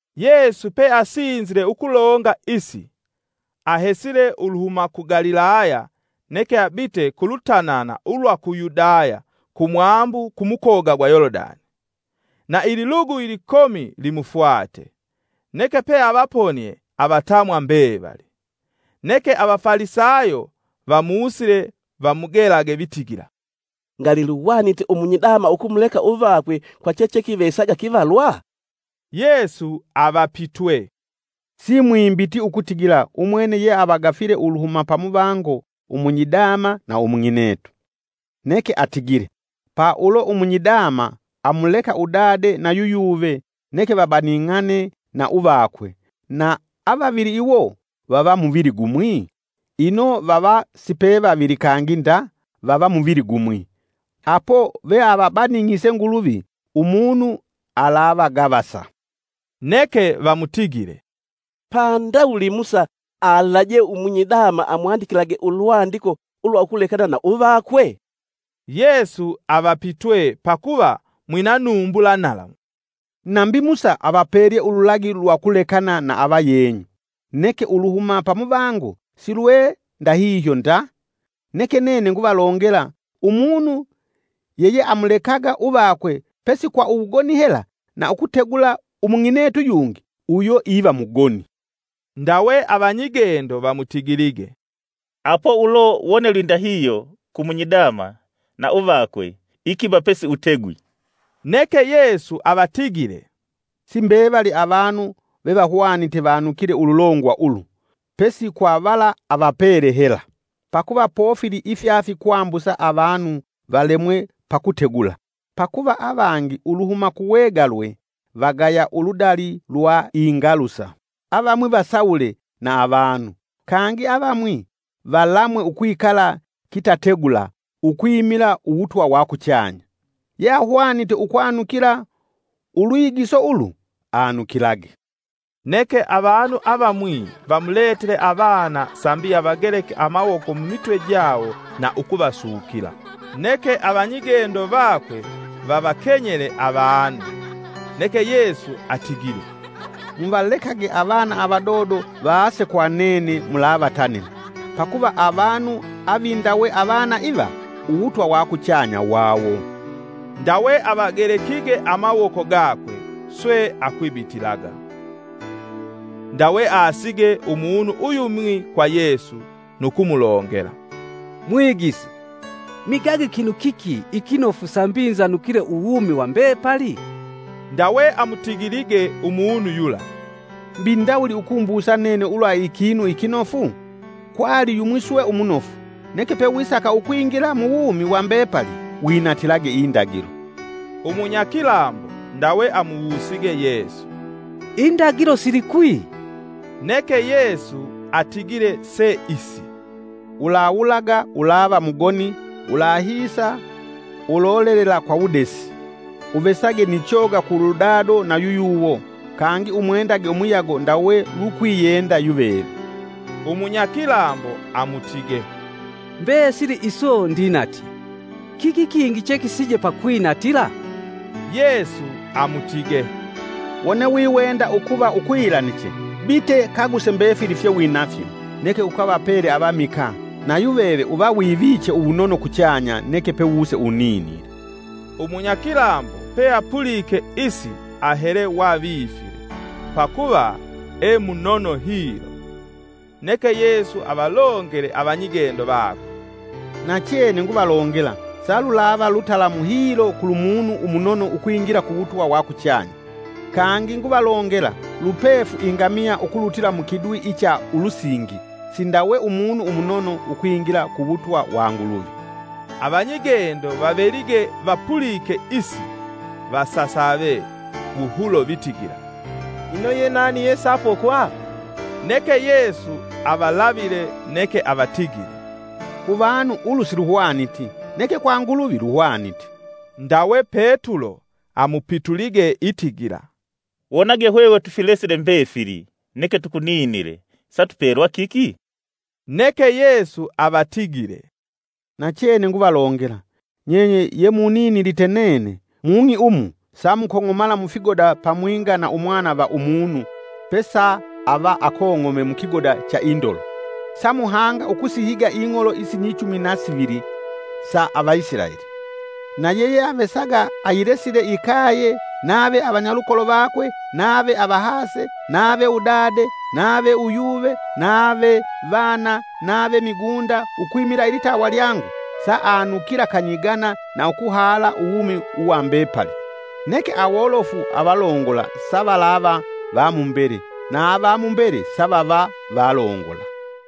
Yesu peasinzile ukulonga isi, ahesile uluhuma ku Galilaya neke abite kulutanana ulwa ku Yudaya kumwambu ku mukoga gwa Yolodani. Na ililugu ilikomi limufwate, neke peavaponie avatamwa mbevali. Neke Avafalisayo vamusile vamugelage vitigila, “Ngali luhwanite umunyidama ukumuleka uvakwe kwa chechekivesaga kivalwa?” Yesu avapitwe, “Simwimbiti ukutigila ukutigila umwene yeavagafile uluhuma pamuvango umunyidama na umung'inetu. Neke atigile: ‘Pa ulo umunyidama amuleka udade na yuyuve neke vabaning'ane na uvakwe, na avavili iwo vava muvili gumwi?’ Ino vava sipevavili kangi nda, vava muvili gumwi. Apo veavabaning'ise Nguluvi umunu alavagavasa.” Neke vamutigile, “Pa ndawuli Musa alaje umunyidama amwandikilage ulwandiko ulwa ukulekana na uvakwe?” Yesu avapitwe, Pakuva mwina numbula nalamu, “Nambi Musa avapelye ululagi lwa ukulekana na avavenyu, neke uluhuma pamuvango silwe ndahihyo nda. Neke nene Nguvalongela: Umunu yeyeamulekaga uvakwe pesi kwa uwugoni hela na ukutegula umung'inetu yungi, uyo iva mugoni.” Ndawe avanyigendo vamutigilige, “Apo ulo wone lwindahihyo ku munyidama na uvakwe, ikiba pesiutegwi.” Neke Yesu avatigile, “Simbevali avanu vevahwanite vanukile ululongwa ulu, pesi kwa vala avapele hela. Pakuva pofili ifyafikwambusa avanu valemwe pa kutegula, pakuva avangi uluhuma kuwegalwe vagaya uludali lwa ingalusa, avamwi vasawule na avanu, kangi avamwi valamwe ukwikala kitategula ukwimila uwutwa wa kuchanya. Yeahwanite ukwanukila ulwigiso ulu anukilage.” Neke avanu avamwi vamuletele avana sambi avageleke amawoko mumitwe jawo na ukuvasukila. Neke avanyigendo vakwe vavakenyele avanu. Neke Yesu atigile, “Muvalekage avana avadodo vaase kwa nene mulavatanila. Pakuva avanu avindawe avana iva, uwutwa wa kuchanya wawo.” Ndawe avagelekige amawoko gakwe. Swe akwibitilaga. Ndawe aasige umunu uyumwi kwa Yesu nu kumulongela, “Mwigisi, migage kinu kiki ikinofu sambi nzanukile uwumi wa mbepali?” Ndawe amutigilige umunu yula, “Mbi ndawuli ukumbusa nene ulwa ikinu ikinofu? Kwali yumwi swe umunofu. Neke pewisaka ukwingila muwumi wa mbepali winatilage indagilo.” Umunyakilambo ndawe amuwusige Yesu, “Indagilo silikwi?” Neke Yesu atigile se isi, “Ulawulaga, ulava mugoni, ulahisa, ulolelela kwa wudesi. Uvesage ni choga kuludado nayuyuwo, kangi umwendage umuyago ndawe lukwiyenda yuveve.” Umunyakilambo amutige, “Mbesili iso ndinatye, kiki kingi chekisige pakwinatila?” Yesu amutige, “Wone wiwenda ukuva ukwilaniche bite kaguse mbefili fye winafyo neke ukavapele avamikaa na yuveve uva wiviche uwunono kuchanya neke pe wuse uninile.” Umunyakilambo peapulike isi ahele wavifile, pakuva e munono hilo. Neke Yesu avalongele avanyigendo vakwe, “Nachene nguvalongela, salulava lutalamu hilo kulu munu umunono ukwingila ku wutwa wa kuchanya. Kangi nguvalongela, lupefu ingamiya ukulutila mukidwi icha ulusingi sindawe umunu umunono ukwingila ku wutwa wa Nguluvi.” Avanyigendo vavelige vapulike isi vasasave wuhulo vitigila, “Ino ye nani yesaapokwa?” Neke Yesu avalavile neke avatigile, “Ku vanu ulu siluhwaniti, neke kwa Nguluvi luhwanite.” Ndawe Petulo amupitulige itigila, “Wonage hwehwe tufilesile mbefili neke tukuninile sa tupelwa kiki?” Neke Yesu avatigile, “Nachene nguvalongela, nyenye yemuninilite nene, mung'i umu samukong'omala mufigoda pamwinga na Umwana va Umunu pesa ava akong'ome mukigoda cha indolo, samuhanga ukusihiga ing'olo isinyichumi na sivili sa Avaisilaeli. Na yeyeavesaga ayilesile ikaye nave avanyalukolo vakwe nave avahase nave udade nave uyuve nave vana nave migunda, ukwimila ilitawa lyangu saavanukila kanyigana na ukuhaha uwumi uwa mbepali. Neke awolofu avalongola savalava va mumbele na vamumbele savava valongola.